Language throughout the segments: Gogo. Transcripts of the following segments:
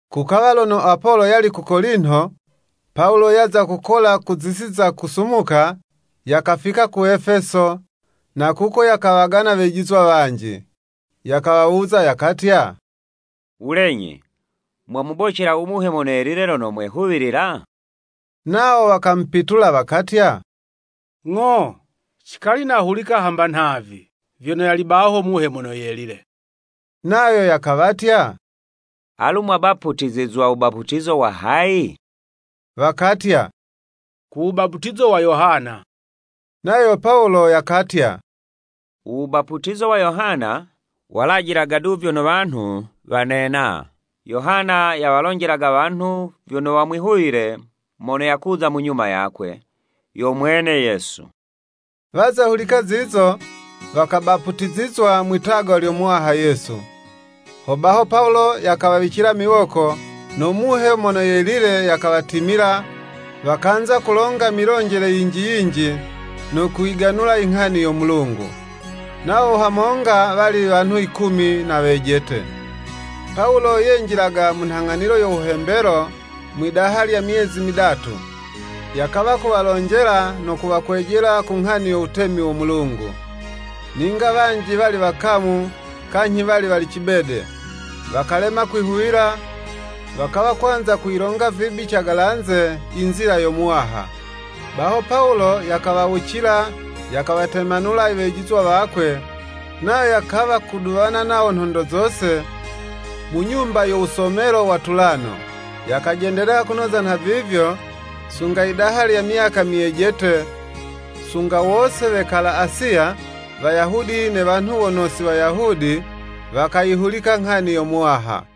Kukawa lono Apolo yali ku Kolinto, Pawulo yaza kukola ku zisi za kusumuka, yakafika ku Efeso, na kuko yakawagana wejizwa wanji. Yakawawuza, yakatya, “Wulenyi, mwamubocela u Muhe Mono Yelile lono mwehuwilila?” Nawo wakamupitula, wakatya, “Ng'o, cikali nahulika hamba nhavi vyono yali baho Muhe Mono Yelile.” Nayo yakawatya, “Alu mwabaputizizwa mu wubaputizo wa hayi?” Wakatya, “Ku wubaputizo wa Yohana.” Nayo Pawulo yakatya, “U wubaputizo wa Yohana, walajilaga du vyono wanhu wanena. Yohana yawalonjelaga wanhu vyono wamwihuwile mono yakuza mu nyuma yakwe, yo mwene Yesu.” Waza hulika zizo, wakabaputizizwa mwitagwa lyo Muwaha Yesu. Hobaho Pawulo yakawawicila miwoko, no Muhe Mono Yelile yakawatimila, wakanza kulonga milonjele yinji yinji, no kuyiganula inghani yo Mulungu. Nawo hamonga wali wanhu yikumi na wejete. Pawulo yenjilaga mu nhang'anilo yo wuhembelo mwidaha lya myezi midatu, yakawa kuwalonjela no kuwakwejela ku nghani yo wutemi wo Mulungu. Ninga wanji wali wakamu, kanyhi wali wali cibede, wakalema kwihuwila, wakawa kwanza kuyilonga vibi cagalanze i nzila yo Muwaha. Baho Pawulo yakawawucila, yakawatemanula iwejizwa wakwe, nayo yakawa kuduwana nawo nhondo zose, mu nyumba yo wusomelo wa Tulano. Yakajendelela kunoza nhavivyo, sunga yidaha lya myaka myejete, sunga wose wekala Asiya, Wayahudi ne wanhu wono si Wayahudi, wakayihulika nghani yo Muwaha.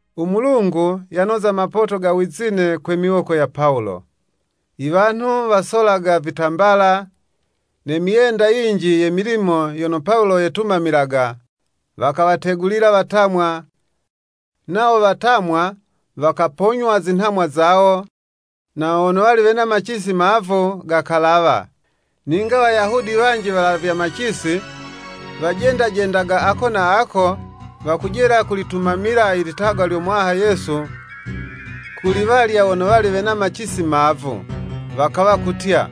U Mulungu yanoza mapoto ga wizine kwe miwoko ya Pawulo. Iwanhu wasolaga vitambala, ne myenda yinji ye milimo yono Pawulo yetumamilaga, wakawategulila watamwa, nawo watamwa wakaponywa zinhamwa zawo, na wono wali wena macisi mavu, gakalawa. Ninga Wayahudi wanji walavya macisi, wajendajendaga ako na ako, wakujela kulitumamila i litagwa lyo Muwaha Yesu kuli walya wono wali wena macisi mavu. Wakawa kutya,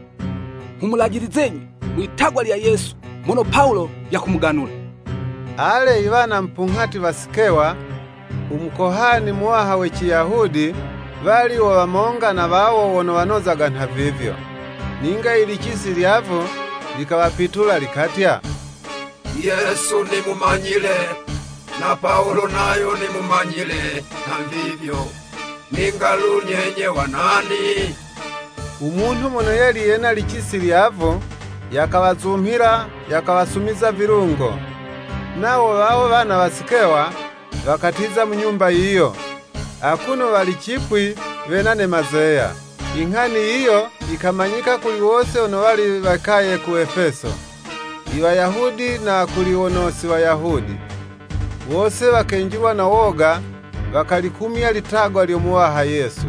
“Nghumulajilizenyi mwi'tagwa lya Yesu mono Pawulo yakumuganula.” Ale, iwana mupunghati wa Sikewa, u Mukohani Muwaha we Ciyahudi, wali wo wamonga na wawo wono wanozaga nhavivyo. Ninga ilicisi lyavu likawapitula likatya, “Yesu nimumanyile, na Pawulo nayo nimumanyile nhavivyo, ninga lu nyenye wa nani?” U munhu mono yali ne licisi lyavu, yakawazumhila, yakawasumiza vilungo, nawo wawo wana wa Sikewa wakatiza mu nyumba yiyo, akuno wali cipwi, wena ne mazeya. Inghani yiyo yikamanyika kuli wose wono wali wekaye ku Efeso, i Wayahudi na kuli wono si Wayahudi. Wose wakenjilwa no woga, wakalikumya litagwa lyo Muwaha Yesu.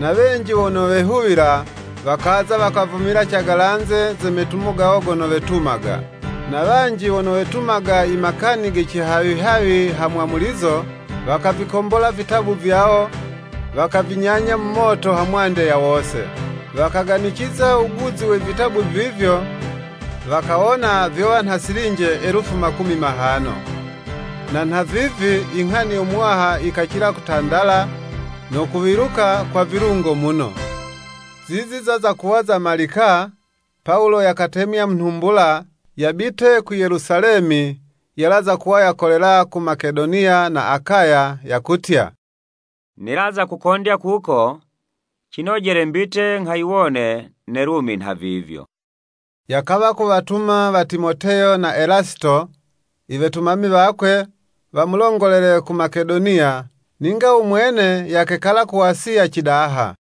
Na wenji wono wehuwila wakaza, wakavumila cagalanze ze metumo gawo gono wetumaga. Na wanji wono wetumaga i makani ge cihawihawi ha mwamulizo, wakavikonghola vitabu vyawo, wakavinyanya mu moto hamwande ya wose. Wakaganiciza wuguzi we vitabu vivyo, wakawona vyowa nha silinje elufu makumi mahano. Na nhavivi, inghani yo Muwaha yikacila kutandala, no kuwiluka kwa vilungo muno. Zizi zaza kuwa zamalika, Pawulo yakatemya mu nhumbula, yabite ku Yelusalemi yalaza kuwa yakolela ku Makedoniya na Akaya, yakutya, “Nilaza kukondya kuko, cinojele mbite nghayiwone ne Lumi nhavivyo.” Yakawa kuwatuma wa Timoteyo na Elasito, iwetumami wakwe, wamulongolele ku Makedoniya, ninga u mwene yakekala ku Asiya cidaha.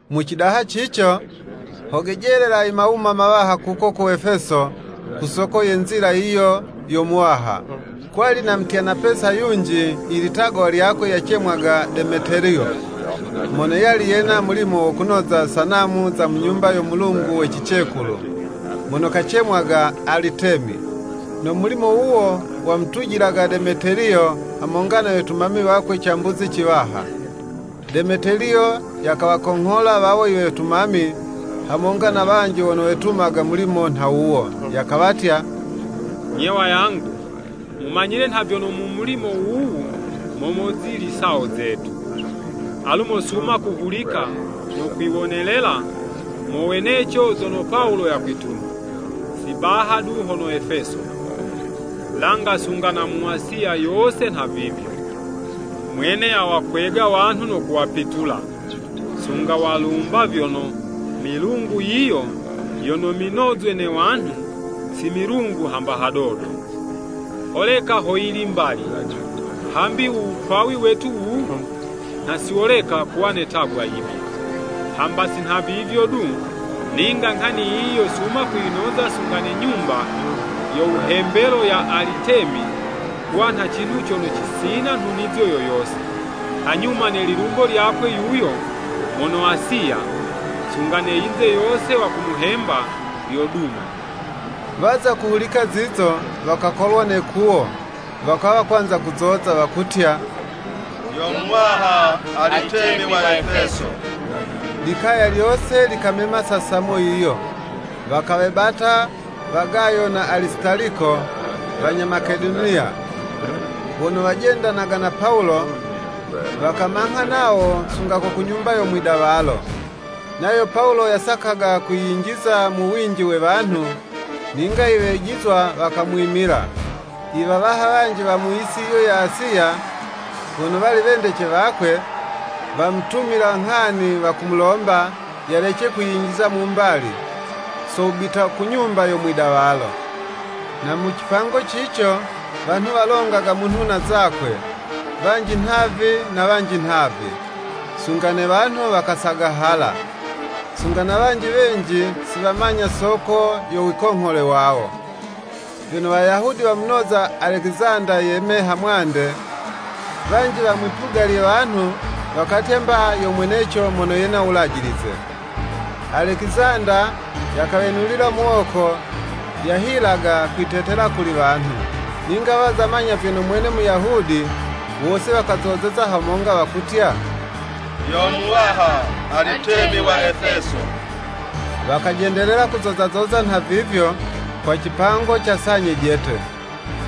Mu cidaha cico, ho gejelela imawuma mawaha kuko ku Efeso, ku soko ye Nzila yiyi yo Muwaha. Kwali na mutyana Pesa yunji ilitagwa lyakwe yacemwaga Demeteliyo, mono yali yena mulimo wo kunoza sanamu za mu nyumba yo mulungu we cicekulu, mono kacemwaga Alitemi. No mulimo wuwo, wamutujilaga Demeteliyo hamonga ne wetumami wakwe, cambuzi ciwaha. Demeteliyo yakawakonghola wawo iwetumami, hamonga na wanji wono wetumaga mulimo nha wuwo, yakawatya, “Nye wayangu, mumanyile nha vyono mu mulimo wuwu mo mozili sawo zetu. Alu mosuma kuhulika no kwiwonelela moweneco zono Pawulo yakwituma, si baha du hono Efeso, langa sunga na mu Asiya yose nhavivyo. Mwene yawakwega wanhu no kuwapitula, sunga walumba vyono, milungu yiyo yono minozwe ne wanhu, si milungu hamba hadodo. Holeka hoyili mbali, hambi uwukwawi wetu wuwu, nha si woleka kuwa ne 'tagwa yibi. Hamba si nhavivyo du, ninga nghani yiyi yosuma kuyinoza sunga ne nyumba yo wuhembelo ya Alitemi kuwa nha cinhu cono cisina nhunizo yo yose. Hanyuma ne lilumbo lyakwe yuyo mono Asiya, sunga ne yinze yose wakumuhemba, lyoduma.” Waza kuhulika zizo, wakakolwa ne 'kuwo, wakawa kwanza kuzoza. Wakutya, “Yo muwaha Alitemi wa Efeso.” Likaya lyose likamema sasamo yiyo. Wakawebata wa Gayo na Alisitaliko, wanya Makedoniya, wono wajendanaga na Pawulo, wakamangha nawo sunga ko ku nyumba yo mwidawalo. Nayo Pawulo yasakaga kwiyinjiza mu winji we wanhu, ninga iwejizwa wakamwimila. Iwawaha wanji wa mu yisi yiyo ya Asiya, wono wali wendece wakwe, wamutumila nghani wakumulomba, yalece kwiyinjiza mu mbali, so wubita ku nyumba yo mwidawalo. Na mu cipango cico wanhu walongaga munhu na zakwe, wanji nhavi na wanji nhavi, sunga ne wanhu wakasagahala. Sunga na wanji wenji, si wamanya soko yo wikonghole wawo. Vyono Wayahudi wamunoza Alekizanda yeme hamwande, wanji wa mwipuga lye wanhu wakatya mba yo mweneco mono yena u wulajilize. Alekizanda, yakawenulila muwoko, yahilaga kwitetela kuli wanhu. Ninga waza manya vyono mwene Muyahudi, wose wakazozeza hamonga, wakutya, “Yo muwaha Alitemi wa Efeso!” Wakajendelela-kuzoza zoza nhavivyo, kwa cipango ca saa nyejete.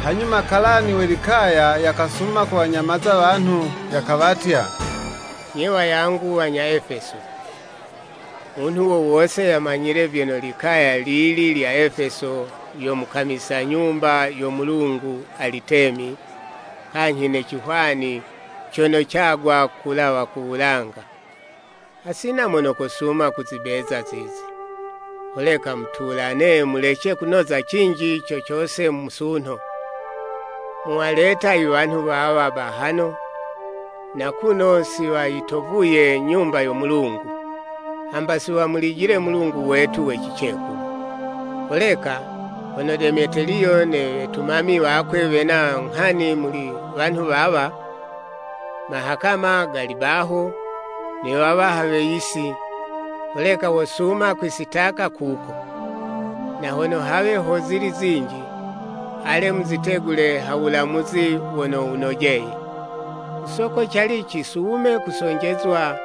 Hanyuma kalani we likaya yakasuma kuwanyamaza wanhu, yakawatya, “Nye wayangu wanya Efeso, munhu wo wose yamanyile vyono likaya lili lya Efeso yo mukamise nyumba yo mulungu Alitemi, kanyhi ne cihwani cono cagwa kulawa ku wulanga. Hasina mono kosuma kuzibeza zizi. Holeka mutulane mulece kunoza cinji co cose musunho. Muwaleta iwanhu wawa bahano, na kuno si wayitovuye nyumba yo mulungu, hamba si wamulijile mulungu wetu we cicekulu. Holeka, hono Demeteliyo ne wetumami wakwe wena nghani muli wanhu wawa, mahakama gali baho, ne wawaha we yisi, holeka wosuma kwisitaka kuko. Na hono hawe ho zili zinji, ale muzitegule ha wulamuzi wono wunojeye. Ku soko cali cisume kusonjezwa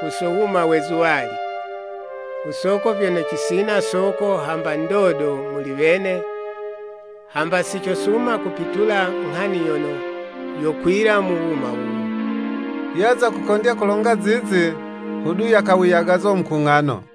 ku so wuma we zuwali, kusoko vyono cisina soko hamba ndodo muli wene, hamba si cosuma kupitula nghani yono yokwila mu wuma wuwu.” Yaza kukondya kulonga zizi, hodu yakawiyagaza mukung'ano.